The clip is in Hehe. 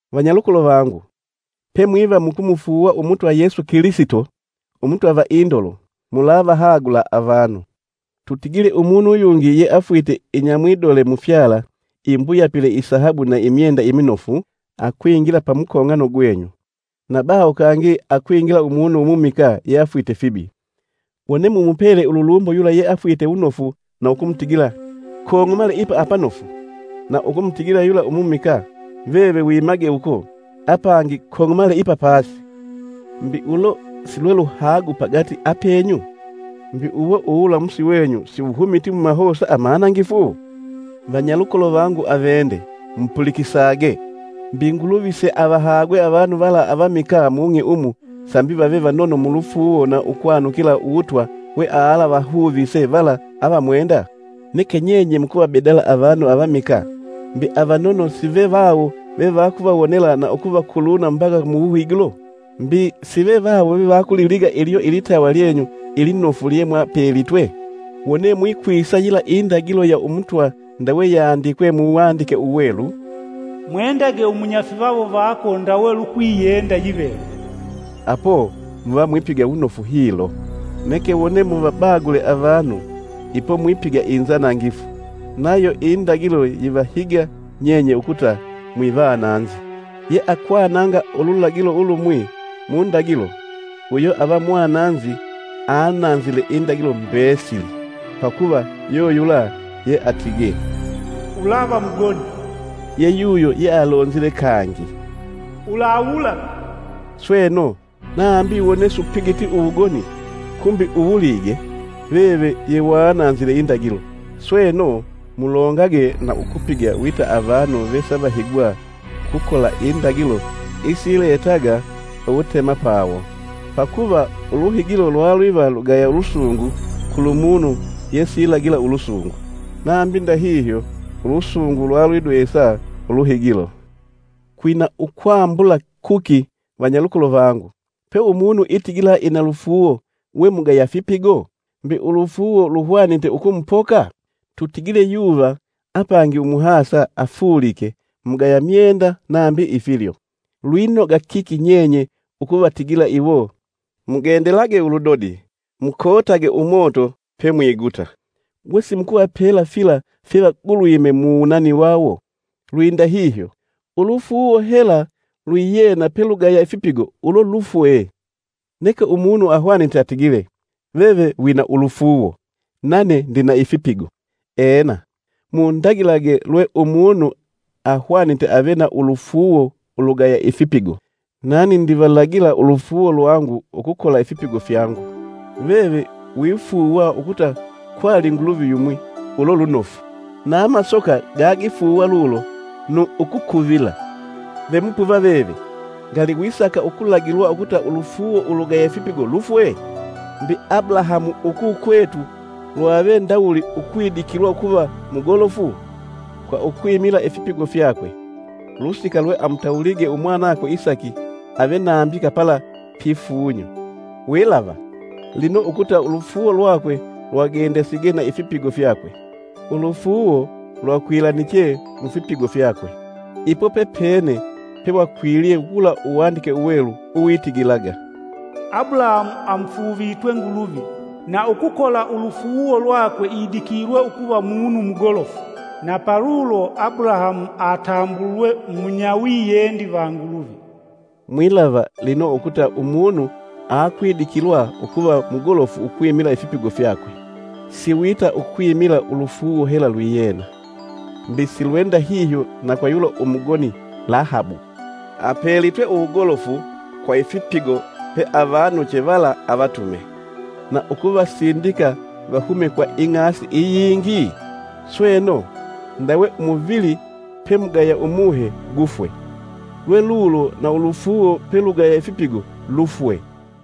Vanyalukolo vangu, pemwiva mukumufuuwa Umutwa Yesu Kilisito Umutwa va indolo, mulavahagula avanu. Tutigile umunu uyungi yeafwite inyamwidole mufyala imbuyapile isahabu na imyenda iminofu, akwingila pamukong'ano gwenyu, na baho kangi akwingila umunu umumikaa yeafwite fibi, wone mumupela ululumbo yula yeafwite wunofu na ukumutigila: “Kong'omale ipa apanofu,” na ukumutigila yula umumikaa, “Veve wimage uko,” apangi, “Kong'omale ipa pasi,” mbi ulo si lwe luhagu pagati apenyu? Mbi uwo uwulamusi wenyu siwuhumiti mumahosa amanangifu? Vanyalukolo vangu avende, mupulikisage! Mbi Nguluvi si avahagwe avanu vala avamikaa mung'i umu sambi vave vanono mu lufuuwo na ukwanukila Uwutwa wealavahuvise vala avamwenda? Neke nyenye mukuvabedala avanu avamikaa! Mbi, avanono sive vawo vevakuvawonela na ukuvakuluna mbaka mu wuhigilo? Mbi sive vawo vevakuliliga ilyo ilitawa lyenyu ilinofu lyemwapelitwe? Wone mwikwisa yila indagilo ya Umutwa ndawe yandikwe mu Wandike Uwelu; “Mwendage umunyafivawo vako ndawe lukwiyenda yiveve,” apo muva mwipiga wunofu hilo. Neke wone muvabagule avanu, ipo, mwipiga inzanangifu, nayo indagilo yivahiga nyenye ukuta mwivananzi. Yeakwananga ululagilo ulumwi mundagilo, uyo ava mwananzi ananzile indagilo mbesili. Pakuva yuyula yeatigee, “Ulava mugoni,” yeyuyo yealonzile kangi, “Ulawulaga.” Sweno, nambi wone supigiti uwugoni, kumbi uwulige, veve yewananzile indagilo. Sweno, mulongage na ukupiga wita avanu vesavahigwa ukukola indagilo isiletaga uwutemapawo. Pakuva uluhigilo lwalwiva lugaya lusungu kulumunu yesilagila ulusungu; nambi ndahihyo ulusungu lwalwidwesa uluhigilo. Kwina ukwambula kuki, vanyalukolo vangu, pe umunu itigila ina lufuuwo we mugaya fipigo? Mbi ulufuuwo luhwanite ukumupoka? Tutigile yuva apangi umuhasa afulike mugaya myenda nambi ifilyo. Lwinoga kiki nyenye ukuvatigila iwo, “Mugendelage uludodi mukootage umoto pemwiguta.” Wesimukuvapela fila fyevagulwime mu wunani wawo? Lwindahihyo, ulufuuwo hela lwiyena pelugaya ifipigo ulo lufwe. Neke umunu ahwanite atigile, “Veve wina ulufuuwo, nane ndina ifipigo!” Ena! Mundagilage lwe umunu ahwanite ave na ulufuuwo ulugaya ifipigo, nani ndivalagila ulufuuwo lwangu ukukola ifipigo fyangu. Veve wifuuwa ukuta kwali Nguluvi yumwi ulo lunofu! Na amasoka gagifuuwa lulo nu ukukuvila. Ve mupuva veve! Ngali, wisaka ukulagilwa ukuta ulufuuwo ulugaya ifipigo lufwe? Mbi Abulahamu ukukwetu lwave ndawuli ukwidikilwa ukuva mugolofu? Kwa ukwimila ifipigo fyakwe, ulusika lweamutawulige umwanakwe Isaki ave nambika pala pifunyo. Wilava, lino ukuta ulufuuwo lwakwe lwagendasige na ifipigo fyakwe; ulufuuwo lwakwilaniche mufipigo fyakwe. Ipo pepene pewakwilye wula Uwandike Uwelu uwitigilaga: “Abulahamu amufuuvitwe Nguluvi, na ukukola ulufuuwo lwakwe idikilwe ukuva munu mugolofu; na palulo Abulahamu atambulwe munyawiyendi va Nguluvi.” Mwilava, lino, ukuta umunu aakwidikilwa ukuva mugolofu ukwimila ifipigo fyakwe, si wita ukwimila ulufuuwo hela lwiyena. Mbi si lwendahihyo na kwa yula umugoni Lahabu; apelitwe uwugolofu kwa ifipigo peavanuche vala avatume, na ukuvasindika vahume kwa ing'asi iyingi? Sweno, ndawe umuvili pemugaya umuhe gufwe, lwelulo na ulufuuwo pelugaya ifipigo lufwe.